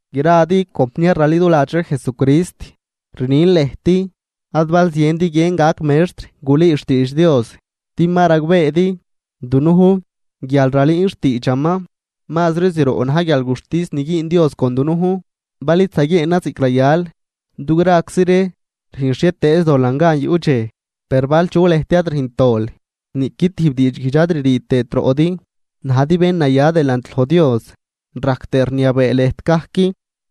Gradi compniar raliduladx ree Jesucrist, rnin lëjt: Ad bal ziendi guiën gac mextr gulüü xtiidx Dios, din ma ragbeedi, dunujn guial ralüün xtiidxaman, mazri zroꞌ na̱j guialguxtis ni güün Dios con dunujn bal id zaguieenan ziꞌc rayal. Du graczi ree rüjn xhietëëz dolan gan yuꞌ dxej, per bal chu lëjt ad rüjnt dol niꞌqui tijb diidxguijdx ad ririi tëët roꞌdi, najdi bén naya delant loj Dios, rajc tëë rniabee lëjt gajc.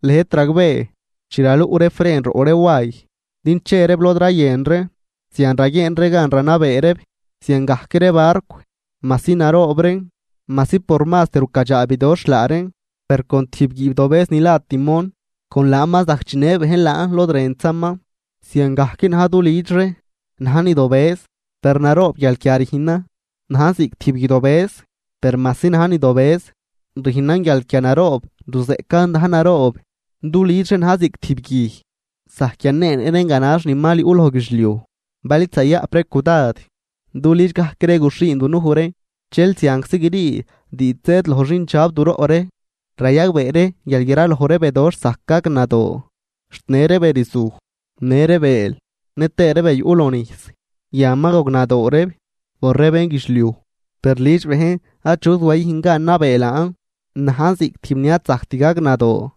Lëjt ragbee, chi raluꞌ ree fren roꞌ ree way din che reeb lod rayën ree, zian raguieen ree gan ranabee reeb. Ziangajc ree barcw, majsi naroob reen, majsi por mazt rucadxaa bidoxh laa reen, per con tijb guiibdobëz ni la timón, con laan ma zajc chinë bejn laan lod rëntzaman. Ziangajc na̱j du lüdx ree, najn ni dobëz, per naroob guialquia rüjnan. Najn ziꞌc tijb guij dobëz, per majsi najn ni dobëz, rüjnan guialquia naroob ruzeꞌcan dajn naroob. Du lüdx ree na̱j ziꞌc tijb guij, zajc yanee nëꞌ reen ganax ni mal yuꞌ loj guidxliuj. Bal id zayaꞌp ree cudad, du lüdx gajc ree guxhiin dunuj ree, dxel zianczi grii diidx zëëd loj xindxab du roꞌ ree. Rayagbee ree guial graloj ree bedoxh zajc gagnadoo, xt në ree be rzuj në ree bëël nëtëë ree be yuꞌ loj nijs, yan ma gognadoo reeb por ree bénguidxliuj. Per lüdx bejn achut wayüjn gan nabee laan, najn ziꞌc tijb ni ad zajct gagnadoo,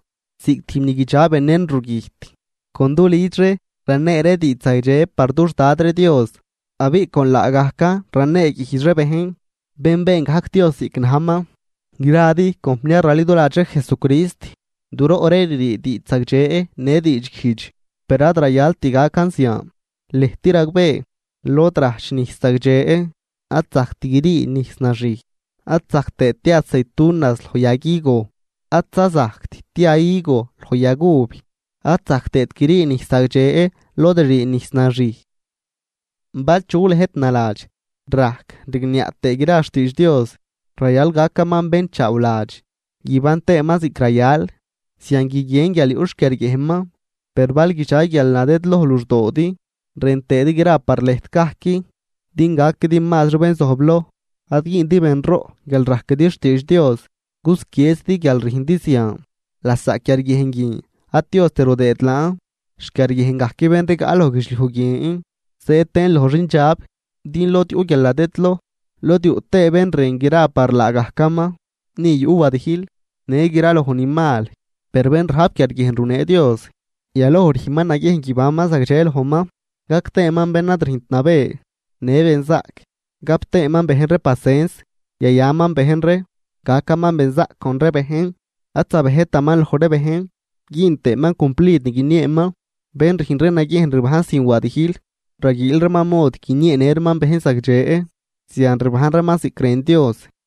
ziꞌc tijb ni guidxa venen rugüjt. Con du lüdx ree ranee ree diidx zagdxe par dux Dad ree Dios, abiꞌ con laagajcan raneeguijdx ree bejn, bén been gajc Dios ziꞌc najman. Gradi compniar raliduladx ree Jesucrist, du roꞌ ree ririi diidx zagdxe në diidxguijdx, per ad rayalt gacan zian. Lëjt ragbee, lod rajch nijs zagdxe ad zajct grii nijs naxij, ad zajc tëët tia aceitunas loj yag higo, ad za zajct tia higo loj yag uv, ad zajc tëët grii nijs zagdxe lod ririi nijs naxij. Bal chu lëjt naladx rajc rigniaꞌ tëë gra xtiidx Dios, rayal gacaman bénchaawladx guiban tëëman ziꞌc rayal, zian guiguien guial yuꞌ xquiarguiejnman. Per bal guidxa guialnadëdloj luxdoodi rën tëëdi gra par lëjt gajc din gaquidi mazri bén zojbloj, ad güündi benroꞌ guial rajquidi xtiidx Dios, cusquieezidi guial rüjndi zian. Lasaꞌ quiarguiejn guin ad Diost rudëë laan, xquiarguiejn gajc bén rigaꞌ loj guidxliuj guien, zëëd tëën loj xindxab. Din lod yuꞌ guialnadëdloj lod yuꞌ tëë bén rën gra par laagajcaman, ni yuꞌ wadijl në gra loj ni mal. Per bén rajp quiarguiejn runee Dios, yaloj rüjnman naguiejn guibanman zagdxe lojman, gac tëëman bén ad rüjnt nabë, në benzaꞌc, gap tëëman bejn ree pasens, yayaman bejn ree, gacaman benzaꞌc con ree bejn, ad zabejtaman loj ree bejn güün tëëman cumplid ni guinieeman. Bén rüjn ree naguiejn ribajn sin wadijl, raguiil reeman mod guinieenë reeman bejn zagdxe, zian rbajn reeman ziꞌc rën Dios.